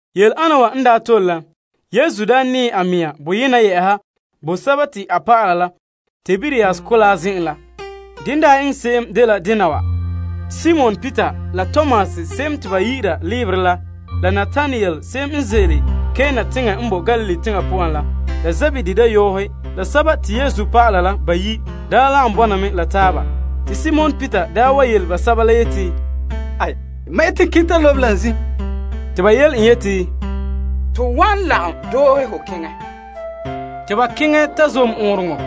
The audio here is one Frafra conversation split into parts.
Yele'ana wa n daa tole la, Yesu piregɛ a mea boyena yɛ'ɛha bo a dɔlɔba Tiberias Mɔgɔrɛ zen'en la. Dene daa eŋɛ se'em dela dena wa. Simon Peter, la Tomas se'em te ba yi'ira Leberɛ la, la Natanael se'em n ze'ele Kana teŋa la n boe Galilee teŋa poan la, la Zebedee dayɔɔhe, la Yesu dɔlɔba la bayi' lagom bɔna me la taaba. Te Simon Peter wa yele basɛba la yeti, Mam yeti n keŋɛ ta lobe la zim. Te ba yele en yeti, To wan lagom doohe ho keŋɛ, ta zom ɔɔnrɔŋɔ.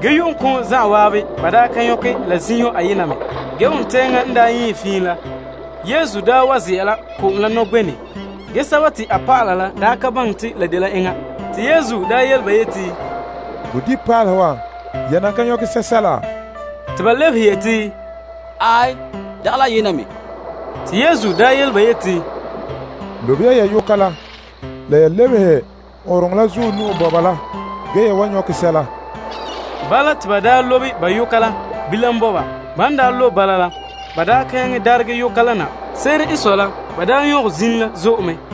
Ge, yu'uŋkoŋɔ zan'an ba daa ka nyɔkɛ la zinho la ayena me. Ge wontɛŋa n daa yɛɛn na la, Yesu wa ze'a la ko'om la nɔgbenɛ. Ge, a dɔlɔba la ka baŋɛ te la dela enŋa. Te Yesu yele ba yeti, Bodibinpaalehe wa, ya nan ka nyɔkɛ sɛsɛla? Te ba lebehe yeti, Aai, dagɛ la ayena me. Te Yesu yele ba yeti, Lobe ya ya yoka la lebehe ɔɔnrɔŋɔ la zuɔ nu'o bɔba la ge ya wan nyɔkɛ sɛla. Bala, te ba lobe ba yoka la bilam bɔba. Ban lobe bala la, ba ka nyaŋɛ daregɛ yoka la na. Se'ere n sɔe la, ba nyɔkɛ zim la zo'e mɛ.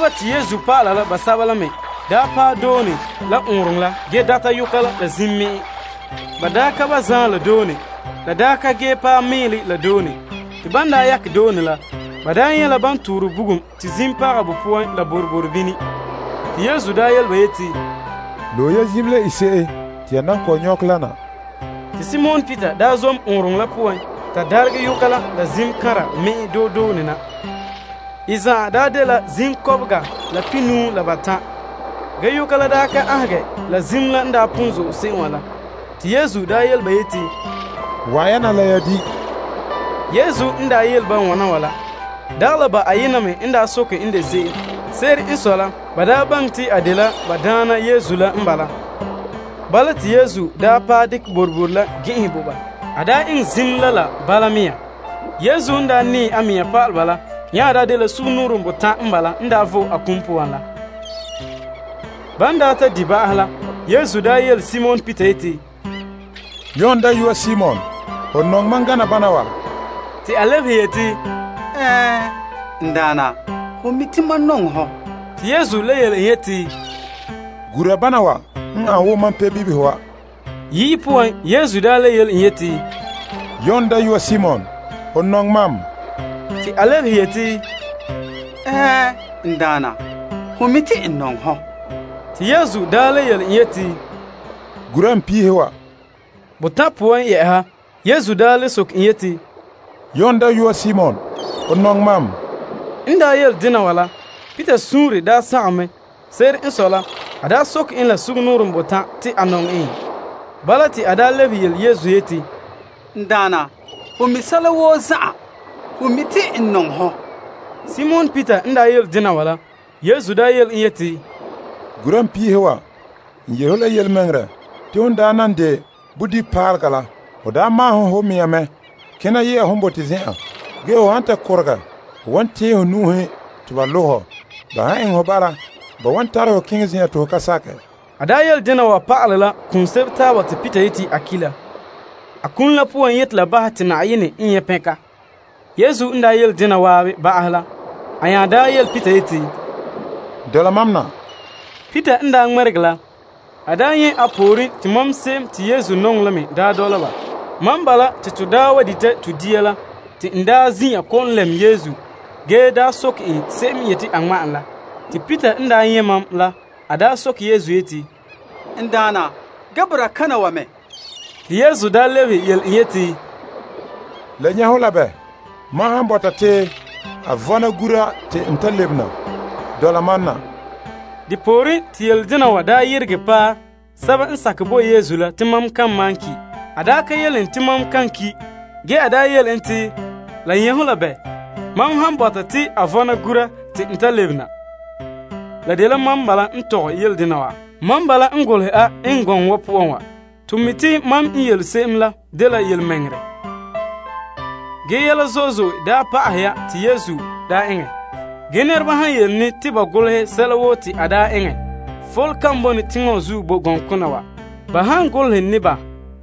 Te Yesu dɔlɔba la basɛba la me paɛ doone la ɔɔnrɔŋɔ la ge yoka la zim me'en. Ba ka ba zaan la doone. La ka paɛ mɛɛlɛ la doone. Te ban daa yakɛ doone la, ba nyɛ' la ban torɛ bugum te zim paga bo poan la boroboro bini. Te Yesu yele ba yeti, Loe ya zim la ise'e te ya nan kɔ'ɔn nyɔkɛ la na. Te Simon Peter zom ɔɔnrɔŋɔ la poan ta daregɛ yoka la zim kanra me'en doe doone na. I zan'an daa dela zim kɔbega la pihinuu la batan'. Ge yoka la ka aanhegɛ bii la zim la n bo zo'e se'em wa la. Te Yesu yele ba yeti, Wa'an ya na la ya di'. Yesu n yele ba wana wa la, dagɛ la ba ayena me n soke en de se'em. Se'ere n sɔe la, ba baŋɛ te a dela ba Daana Yesu la n bala. Bala, te Yesu paɛ dekɛ boroboro la gɛn'ɛnhɛ bo ba. A eŋɛ zim la la bala mea nɔɔ. Yesu n daa piregɛ a mea pa'alɛ ba la nya dela sugumnɔɔren botan' n bala te a n daa vo'e a kum poan la. Ban daa ta di' ba'ahɛ la, Yesu yele Simon Peter yeti, Yon dayɔa Simon, ho nɔŋɛ mam gana bana wa? Te a lebehe yeti, Ɛɛn, n Daana, ho mi' te mam nɔŋɛ hɔ. Te Yesu le yele en yeti, Gura bana wa n ane wo mam pebibihe wa. Yi'i poan Yesu daa le yele en yeti, Yon dayɔa Simon, ho nɔŋɛ mam? Te a lebehe yeti, Ɛɛn, n Daana, ho mi' te n nɔŋɛ hɔ. Te Yesu daa le yele en yeti, Gura n piihe wa. Botan' poan Yesu le soke en yeti, Yon dayɔa Simon, ho nɔŋɛ mam? N yele dena wa la, Peter suunre sagom mɛ. Se'ere n sɔe la, a soke en la sugumnɔɔren botan' te a nɔŋɛ en. Bala, te a lebehe yele Yesu yeti, N Daana, hon mi' sɛla woo zan'an. Ho mi' te n nɔŋɛ hɔ. Simon Peter n yele dena wa la, Yesu yele en yeti, Gura n piihe wa. N yele ho la yelemɛŋɛrɛ, te hon na de bodibipaalega la, ho maahene ho mea mɛ kena ye'a hon bote zen'an. Ge, ho han ta korogɛ, ho wan tɛɛn ho nu'uhen te ba lo' hɔ. Ban han eŋɛ ho bala, ba wan tare hɔ keŋɛ zen'en te ho ka sakɛ. A yele dena wa pa'ala la kum sebo taaba te Peter yeti a ki' la. A kum la poan yeti la bahɛ te Na'ayenɛ n nyɛ' pɛnka. Yesu n yele en dena zan'an ba'ahɛ la, a nya yele Peter yeti, Dɔla mam na. Peter n daa ŋmɛregɛ la, a nyɛ' a pooren te mam se'em te Yesu nɔŋɛ me dɔla ba. Mam bala te to wa dita to dia la te n zin'an kɔ'ɔn lɛm Yesu ge soke en se'em n yeti a ŋma' en la. Te Peter n daa nyɛ' mam la, a soke Yesu yeti, N Daana, ge boraa kana wa me? Te Yesu lebehe yele en yeti, La nyɛ' ho la bɛ, mam han bɔta en te a vɔna gura te n ta lebe na? Dɔla mam na. Depooren, te yele dena wa yeregɛ paɛ sɛba n sakɛ bo Yesu la te mam kan malom ki'. A da ka yele en te mam kan ki', ge a yele en te, La nyɛ' ho la bɛ, mam han bɔta en te a vɔna gura te n ta lebe na? La dela mam bala n tɔgɛ yele ana wa. Mam bala n me golehɛ a, eŋɛ gɔŋɔ wa poan wa. To me mi' te mam yele se'em la dela yelemɛŋɛrɛ. Ge yɛla zo'e zo'e pa'ahɛ ya te Yesu eŋɛ. Ge nɛreba han yeti ne te ba golehɛ sɛla woo te a eŋɛ, fole kan bone teŋa wa zuo boe gɔŋkona wa, ba han golehɛ ne ba.